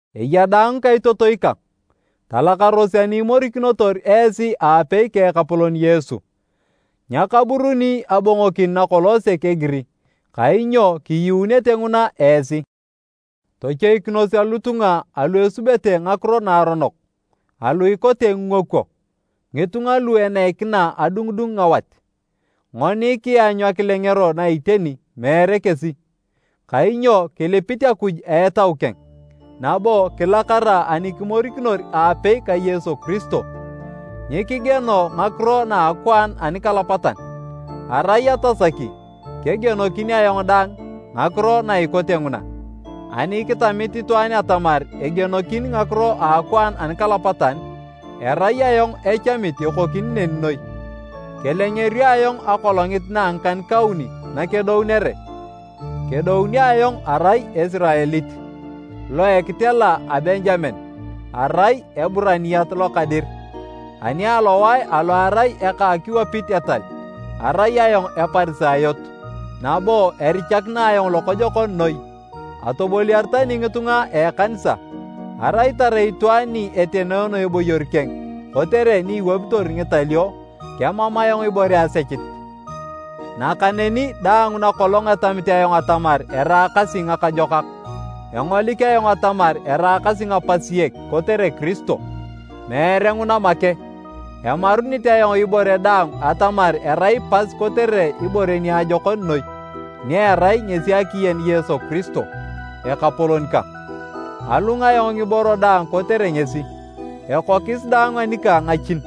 Eya daang ngikaitotoi kang, talakaros ani imorikinitor esi aapei ka Ekapolon Yesu. Nyakaburuni abongokin nakolong sek egiri, kainyo kiyuunete nguna esi. Tochoikinos alotunga alu esubete ngakiro naaronok, alu ikote ngingokwo, ngitunga lu eneikina adungudung ngawat. Ngoni kianyu akilengero na iteni, meere kesi. Kainyo kilipit Akuj a Etau keng, nabo kilakara ani kimorikinor aapei ka Yesu Kiristo. Nyikigieno ngakiro na a akwaan anikalapatan. Arai atasaki, kegienokin ayong dang ngakiro na ikote nguna. Ani kitamit itwaan atamar egienokin ngakiro a akwaan anikalapatan, erai ayong echamit ekokini neni noi. Kelengerio ayong akolongit na a ngikan-kauni nakedounere. Kedounio ayong arai Esiraelit, lo a ekitela a Benjamen, arai Eburaniait lokadir. Ani alowae alo erai eka akiwapit etal, arai ayong Eparisayot, nabo erichakina ayong lokojokon noi atoboliar tani ngitunga a ekanisa. Arai tarai itwaan ni etenoono eboyor keng kotere ni iwapitor ngitalio, kemam ayong ibore asechit. Nakaneni daang nakolong etamit ayong atamar eraakasi ngakajokak, engolik ayong atamar eraakasi ngapasiek kotere Kiristo. Meere nguna make, emarunit ayong ibore daang atamar erai pas kotere ibore niajokon noi, ni erai ngesi akiyen Yesu Kiristo, Ekapolon kang. Alung ayong ngiboro daang kotere ngesi, ekokis daang anikang ngachin,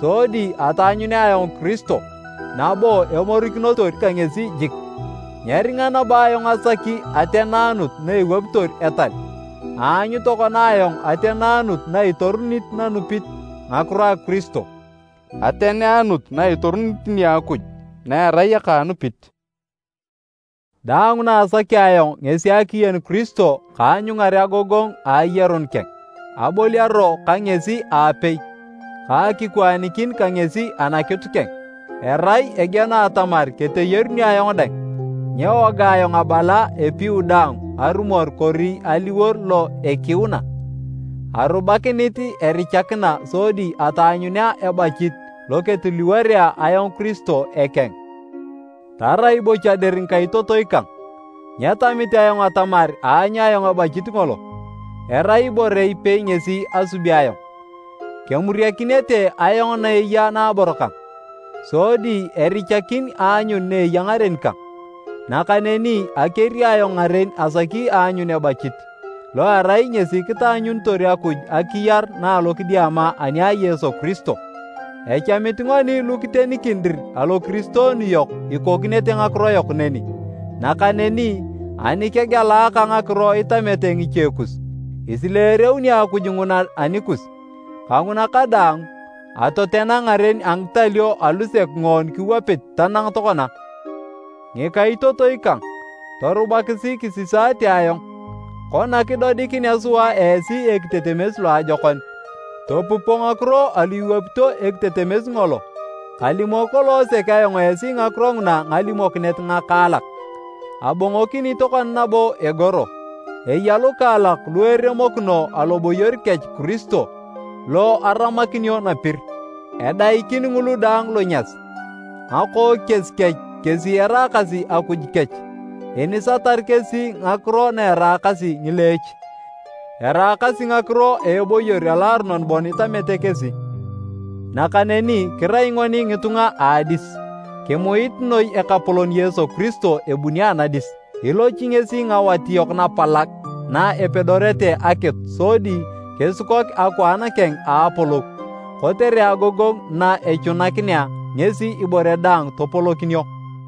sodi ataanyunea ayong Kiristo nabo emorikinotor ka ngesi jik. Nyeringa nabo ayong asaki ateneanut na ewapitor etal, aanyu tokona ayong ateneanut na itorunit nanupit ngakiro a Kiristo. Ateneanut na itorunit nia Akuj na erai aka anupit. Daang na asaki ayong ngesi akiyen Kiristo ka aanyungar agogongu a ayarun keng, aboliaro ka ngesi aapei ka akikwaanikin ka ngesi anakitu keng, erai egieno atamar keteyarunio ayong dang. Nyewoga ayong abala epiu daang arumor kori aliwor lo ekiuna. Arubakinit erichakina sodi ataanyunea ebachit lo ketiliworea ayong Kiristo ekeng. Tarai bocha dir ngikaitotoi kang, nyetamit ayong atamar aanyu ayong ebachit ngolo. Erai ibore ipei ngesi asubi ayong, kemuriakinete ayong na eya naabor kang, sodi erichakin aanyun na eya ngaren kang. Nakaneni akeri ayong ngaren asaki aanyun ebachit, lo erai ngesi kitaanyunitor Akuj akiyar na a alokidiama ani a Yesu Kiristo. Echamit ngoni lu kitenikin dir alokiristoonu yok ikokinete ngakiro yok neni. Nakaneni ani kegelaaka ngakiro itamete ngiche kus, isileereuni Akuj nguna anikus. Kanguna kadaang, atotena ngaren a ngitalio alusek ngoon kiwapit tanang tokona. Ngikaitotoi kang, torubakisi kisisaate ayong. Kona kidodikinea sua esi ekitetemes loajokon, topupo ngakiro alu iwapito ekitetemes ngolo. Kalimok kolong sek ayong esi ngakiro nguna ngalimokinet ngakaalak, abongokini tokona nabo egoro, eya lukaalak lu eremokino aloboyor kech Kiristo lo aramakinio napir. Edaikin ngulu daang lonyas, ngakookies kech kesi eraakasi akuj kech. Inisatar kesi ngakiro na eraakasi ngileech, eraakasi ngakiro a eboyor aloaronon bon itamete kesi. Nakaneni kirai ngoni ngitunga a adis, kimuit noi Ekapolon Yesu Kiristo ebuni anadis. Ilochi ngesi ngawat yok napalag na epedorete akitu sodi kisikok akwaan keng a apolou, kotere agogongu na echunakinea ngesi ibore daang topolokinio.